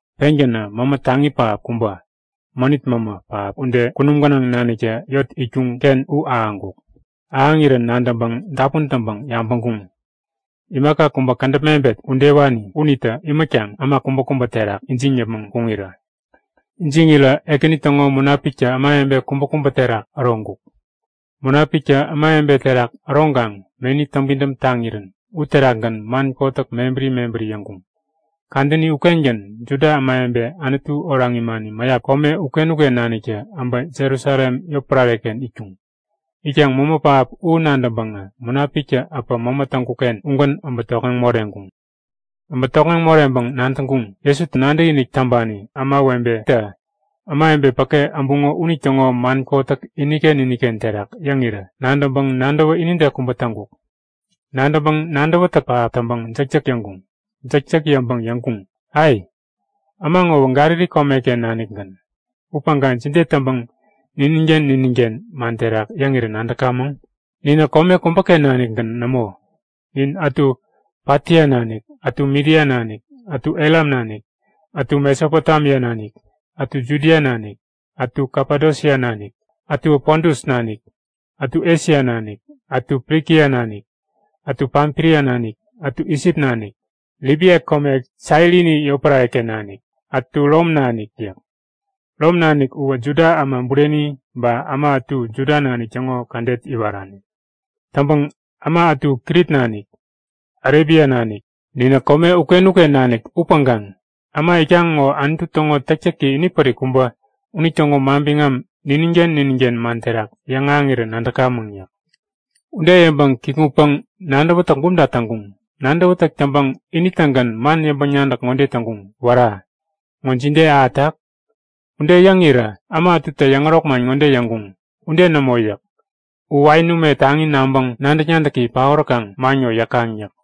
Pengänä mämä taŋi pähap kubä, mänit mämä pähap ude kunum gänaŋ naniktä yot itkuŋ-ken u ahäŋkuk. Ahäŋirän nadäŋpäŋ dapun täŋpäŋ yabäŋkuŋ; Imaka kubä kädäp mebet udewani unitä imätkaŋ äma kubäkubä terak ijiŋ yäpmäŋ kuŋirä. Ijiŋirä Ekäni täŋo Munapiktä ämawebe kubäkubä terak äroŋkuk. Munapiktä ämawebe terak äroŋkaŋ meni täŋpidäm taŋirän uterakgän man kotäk mebäri mebäri yäŋkuŋ. Kadäni ukengän Juda ämawebe Anutu oraŋ imani mäyap kome uken-uken naniktä abä Jerusalem yotpärare-ken itkuŋ. Itkaŋ mämä pähap u nadäŋpäŋä Munapiktä äpä mämä täŋkuk-ken ugän abä tokŋeŋ moreŋkuŋ. Abä tokŋeŋ moreŋpäŋ nadäŋkuŋ; Jesuta nadäkinik täŋpani ämawebetä ämawebe päke äbuŋo unitäŋo man kotäk iniken iniken terak yäŋirä nadäŋpäŋ nadäwä inide kubä täŋkuk. Nadäŋpäŋ nadäwätäk pähap täŋpäŋ jäkjäk yäŋkuŋ. Jäkjäk yäŋpäŋ yäŋkuŋ; Ai! Äma ŋowä Galili komeken nanikgän. Upäŋkaŋ jide täŋpäŋ nininken nininken man terak yäŋirä nadäkamäŋ? Ninä kome kubäken nanikgän nämo. Nin ätu Patia nanik, ätu Midia nanik, ätu Elam nanik, ätu Mesopotemia nanik, ätu Judia nanik, ätu Kapadosia nanik, ätuwä Pontus nanik, ätu Esia nanik, ätu Frikia nanik, ätu Pamfilia nanik, ätu Isip nanik, ätu Libia kome Sairini yotpärare-ken nanik, ätu Rom nanik yäk. Rom nanik uwä Juda äma bureni ba äma ätu Juda nanik täŋo kädet iwarani. Täŋpäŋ äma ätu Krit nanik, Arebia nanik yäk. Ninä kome uken-uken nanik upäŋkaŋ äma itkaŋ ŋo Anutu täŋo täktäki inipärik kubä unitäŋo manbiŋam nininken nininken man terak yäŋahäŋirä nadäkamäŋ! yäk. Ude yäŋpäŋ kikŋutpäŋ-nadäwätäk bumta täŋkuŋ. Nadäwätäk täŋpäŋ ini-tägän man yäŋpäŋ-nadäk ŋode täŋkuŋ; Wära! Ŋo jide ahätak? Ude yäŋirä äma ätutä yäŋärok man ŋode yäŋkuŋ; Ude nämo! yäk. U wain ume taŋi naŋpäŋ nadäk-nadäki paoräkaŋ man ŋo yäkaŋ yäk.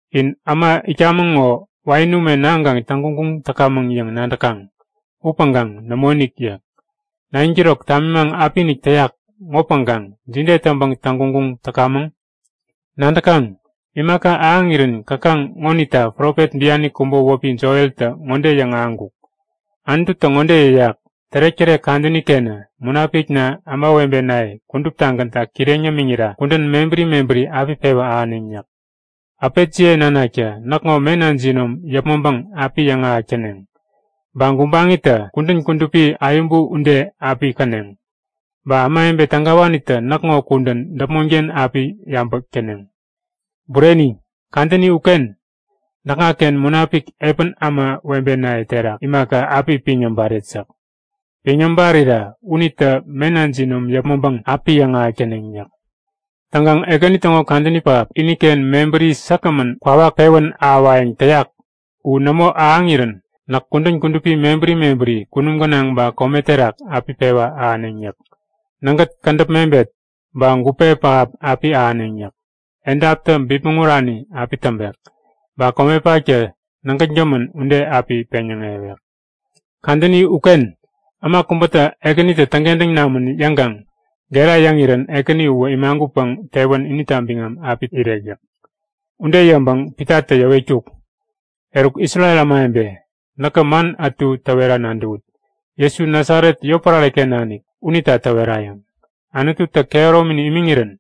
In äma itkamäŋ ŋo wain ume naŋkaŋ täŋguŋguŋ täkamäŋ yäŋ nadäkaŋ, upäŋkaŋ nämoinik yäk. 9'kirok tamimaŋ apiinik täyak ŋopäŋkaŋ jide täŋpäŋ täŋguŋguŋ täkamäŋ? Nadäkaŋ? Imaka ahäŋirän käkaŋ ŋonita profet biani kubä wäpi Joeltä ŋode yäŋahäŋkuk; Anututä ŋode yäyak; Tärektärek kadäni-kenä Munapikna ämawebenaye kuduptagänta kireŋ yämiŋira kudän mebäri mebäri api pewä ahäneŋ yäk. Äpetjiye nanaktä näkŋo mena jinom yäpmäŋpäŋ api yäŋahäk täneŋ. Ba gubaŋitä kudän kudupi ayäbu ude api käneŋ, Ba ämawebe tägawanitä näkŋo kudän däpmonken api yabäk täneŋ. Bureni, kadäni uken näkŋaken Munapik epän ämawebenaye terak imaka, api piŋ yäbaret yäk. Piŋ yäbarira unitä mena jinom yäpmäŋpäŋ api yäŋahäk täneŋ yäk. Täŋkaŋ Ekäni täŋo kadäni pähap, iniken mebäri säkgämän kwawak pewän ahäwayäŋ täyak u nämo ahäŋirän näk kudän kudupi mebäri mebäri kunum gänaŋ ba kome terak api pewa ahäneŋ yäk. Nägät, kädäp mebet, ba gupe pähap api ahäneŋ yäk. Edaptä bipmäŋ urani api täŋpek. Ba komepaktä nägätgämän ude api peŋyäŋewek. Kadäni uken äma kubätä Ekänitä täŋkentäŋ namän yäŋkaŋ gera yäŋirän Ekäni uwä imagutpäŋ tewän inita biŋam api irek yäk. Ude yäŋpäŋ Pitatä yäwetkuk; Eruk Isrel ämawebe, näkä man ätu täwera nadäwut; Jesu Nasaret yotpärare-ken nanik unita täwerayäŋ. Anututä kehäromi imiŋirän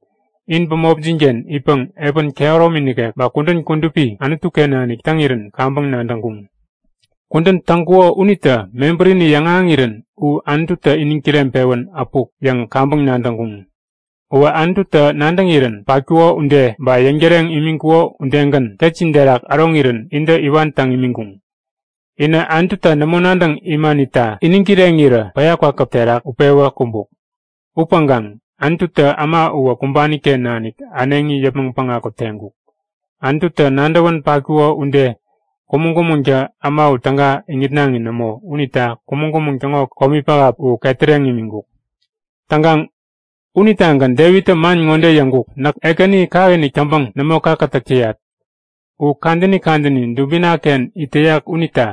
in bämopjin-ken itpäŋ epän kehäromi nikek ba kudän kudupi Anutu-ken nanik täŋirän kaŋpäŋ nadäŋkuŋ. Kudän täŋkuko unitä mebärini yäŋahäŋirän u Anututä iniŋ kireŋpewän äpuk yäŋ kaŋpäŋ nadäŋkuŋ. Uwä Anututä nadäŋirän patkuko ude, ba yäŋtäreŋ imiŋkuko udegän, ketjin terak äroŋirän intä iwan täŋ imiŋkuŋ. Inä Anututa nämo nadäŋ imanita iniŋ kireŋirä päya kwakäp terak utpewä kumbuk. Upäŋkaŋ Anututä äma uwä kumbani-ken nanik äneŋi yäpmäŋ päŋaku teŋkuk. Anututä nadäwän patkuko ude kumäŋ-kumäŋtä äma u täga iŋitnaŋi nämo unita kumäŋ-kumäŋ täŋo komi pähap u ketäreŋ imiŋkuk. Täŋkaŋ unitagän Devittä man ŋode yäŋkuk; Näk Ekäni kakinik täŋpäŋ nämo kakätäk täyat. U kadäni kadäni dubina-ken it täyak unita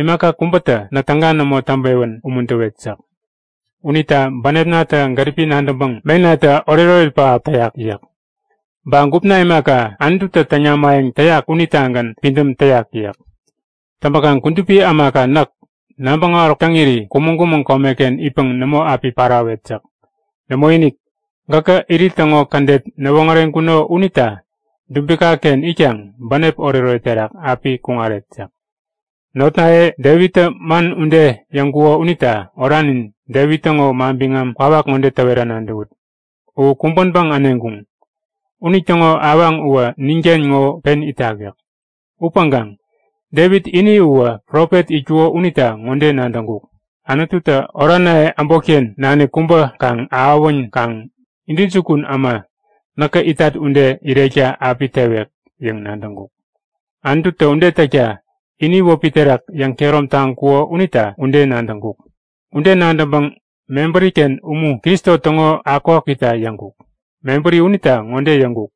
imaka kubätä näk täga nämo täŋpewän umuntäwet yäk. Unita bänepnatä gäripi nadäŋpäŋ menatä oretoret pähap täyak yäk. Ba gupna imaka, Anututä täŋ namayäŋ täyak unitagän pidäm täyak yäk. Täŋpäkaŋ kudupi ämaka näk nabäŋ äwaräkuk täŋiri kumäŋ-kumäŋ komeken itpäŋ nämo api parawet yäk. Nämoinik, gäkä irit täŋo kädet näwoŋäreŋkuno unita dubika-ken itkaŋ bänep oretoret terak api kuŋaret yäk. Notnaye, Devittä man ude yäŋkuko unita oranin Devit täŋo manbiŋam kwawak ŋode täwera nadäwut; U kumbänpäŋ äneŋkuŋ. Unitäŋo awaŋ uwä ninken ŋo pen itak yäk. Upäŋkaŋ Devit ini uwä profet itkuko unita ŋode nadäŋkuk; Anututä oranaye äbotken nanik kubä kaŋ-ahäwänkaŋ intäjukun äma näkä itat ude irekta api tewek yäŋ nadäŋkuk. Anututä ude täkta ini wäpi terak yäŋkehärom taŋkuko unita ude nadäŋkuk. Ude nadäŋpäŋ mebäri-ken umu Kristo täŋo akukakukita yäŋkuk. Mebäri unita ŋode yäŋkuk;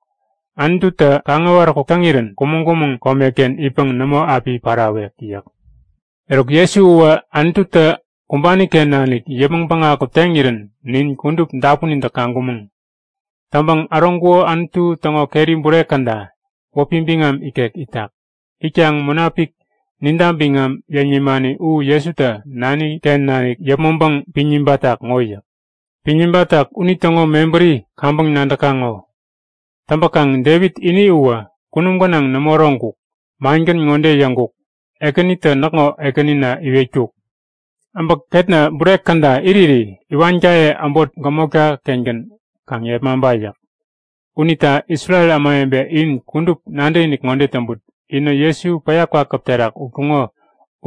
Anututä kaŋ-äwaräkuk täŋirän kumäŋ-kumäŋ komeken itpäŋ nämo api parawek yäk. Eruk, Jesu uwä Anututä kumbani-ken nanik yäpmäŋ päŋaku teŋirän nin kudup dapunintä kaŋkumäŋ. Täŋpäŋ äroŋkuko Anutu täŋo keri bure käda wäpi biŋam ikek itak. Itkaŋ Munapik ninta biŋam yäŋ nimani u Jesutä Nani-ken nanik yäpmäŋpäŋ piŋ nibatak ŋo yäk. Piŋ nibatak unitäŋo mebäri kaŋpäŋ nadäkaŋ ŋo. Täŋpäkaŋ Devit ini uwä kunum gänaŋ nämo äroŋkuk. Mangän ŋode yäŋkuk; Ekänitä näkŋo ekänina iwetkuk; Abä ketna bure käda iriri iwankaye äbot gämotka-kengän kaŋ yepmaŋpa yäk. Unita Isrel ämawebe in kudup nadäkinik ŋode täŋput; Inä Jesu päya kwakäp terak utkuŋo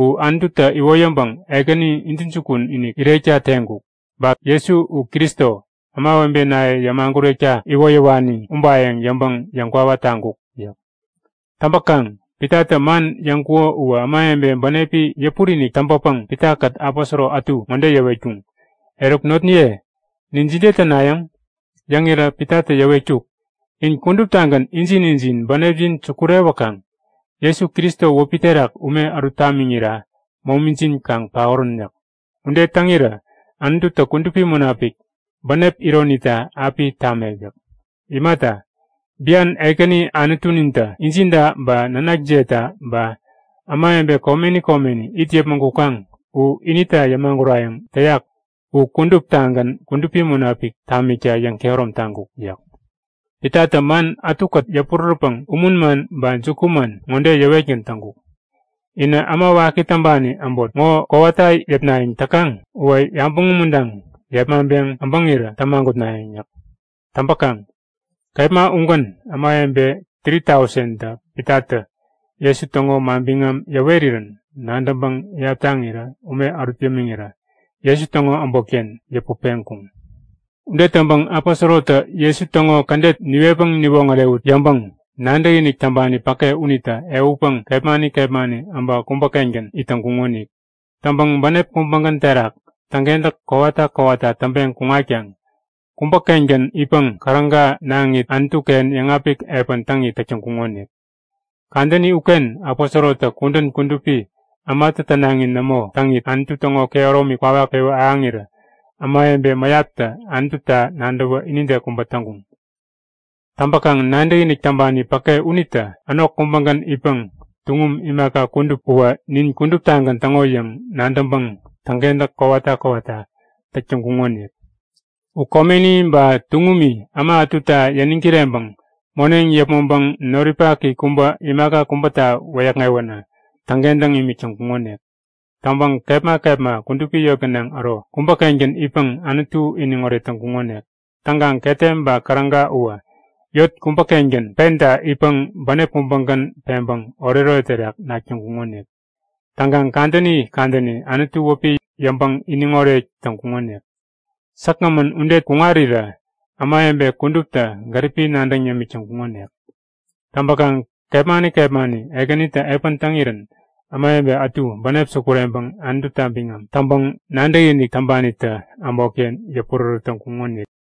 u Anututä iwoyäŋpäŋ Ekäni intäjukun-inik irekta teŋkuk. Ba Jesu u Kristo, ämawebenaye yämagurekta iwoyäwani ubayäŋ yäŋpäŋ yäŋkwawa taŋkuk yäk. Täŋpäkaŋ Pitatä man yäŋkuko uwä ämawebe bänepi yäpurinik täŋpäpäŋ Pitakät aposoro ätu ŋode yäwetkuŋ; Eruk notniye, nin jide tänayäŋ? Yäŋirä Pitatä yäwetkuk; In kuduptagän injin injin bänepjin sukurewäkaŋ Jesu Kristo wäpi terak ume ärut tamiŋirä momijin kaŋ paorän yäk. Ude täŋirä Anututä Kudupi Munapik, bänep ironita api tamek yäk. Imata, bian Ekäni Anutunintä injinta ba nanakjiyeta ba ämawebe komeni komeni it yäpmäŋ kukaŋ u inita yämagurayäŋ täyak u kuduptagän Kudupi Munapik tamikta yäŋkehärom taŋkuk yäk. Pitatä man ätukät yäpurärätpäŋ umun man ba jukuman ŋode yäwetgän täŋkuk; Inä äma waki täŋpani äbot ŋo kowata yäpnayäŋ täkaŋ uwä yabäŋ umuntaŋ yepmaŋpeŋ äbäŋirä tämagutnayäŋ yäk. Täŋpäkaŋ kepma ugän ämawebe 3000tä Pitatä Jesu täŋo manbiŋam yäwerirän nadäŋpäŋ iyap täŋirä ume ärut yämiŋirä Jesu täŋo äbotken yäput peŋkuŋ. Ude täŋpäŋ aposorotä Jesu täŋo kädet niwetpäŋ niwoŋärewut yäŋpäŋ nadäkinik täŋpani päke unitä ehutpäŋ kepmani kepmani abä kubä-kengän it täŋkuŋonik. Täŋpäŋ bänep kubägän terak täŋkentäk kowata kowata täŋpeŋ kuŋatkaŋ kubä-kengän itpäŋ käräga naŋit Anutu-ken yäŋapik epän täŋit täk täŋkuŋonik. Kadäni uken aposorotä kudän kudupi ämatä tänaŋi nämo täŋit, Anutu täŋo kehäromi kwawak pewä ahäŋirä ämawebe mäyaptä Anututa nadäwä inide kubä täŋkuŋ. Täŋpäkaŋ nadäkinik täŋpani päke unitä änok kubägän itpäŋ tuŋum imaka kudup uwä nin kuduptagän täŋo yäŋ nadäŋpäŋ täŋkentäk kowata kowata täk täŋkuŋonik. U komeni ba tuŋumi äma ätuta yäniŋ kireŋpäŋ moneŋ yäpmäŋpäŋ noripaki kubä imaka kubäta wäyäkŋewänä täŋkentäŋ imik täŋkuŋonik. Täŋpäŋ kepma kepma kudupi yot gänaŋ äro kubä-kengän itpäŋ Anutu iniŋoret täŋkuŋonik. Täŋkaŋ ketem ba käräga uwä, yot kubäkubäken penta itpäŋ bänep kubägän peŋpäŋ oretoret terak nak täŋkuŋonik. Täŋkaŋ kadäni kadäni Anutu wäpi yäŋpäŋ iniŋoret täŋkuŋonik. Säkgämän ude kuŋarirä ämawebe kuduptä gäripi nadäŋ yämik täŋkuŋonik. Täŋpäkaŋ kepmani kepmani Ekänitä epän täŋirän ämawebe ätu bänep sukureŋpäŋ Anututa biŋam täŋpäŋ nadäkinik täŋpanitä äbotken yäpurärät täŋkuŋonik.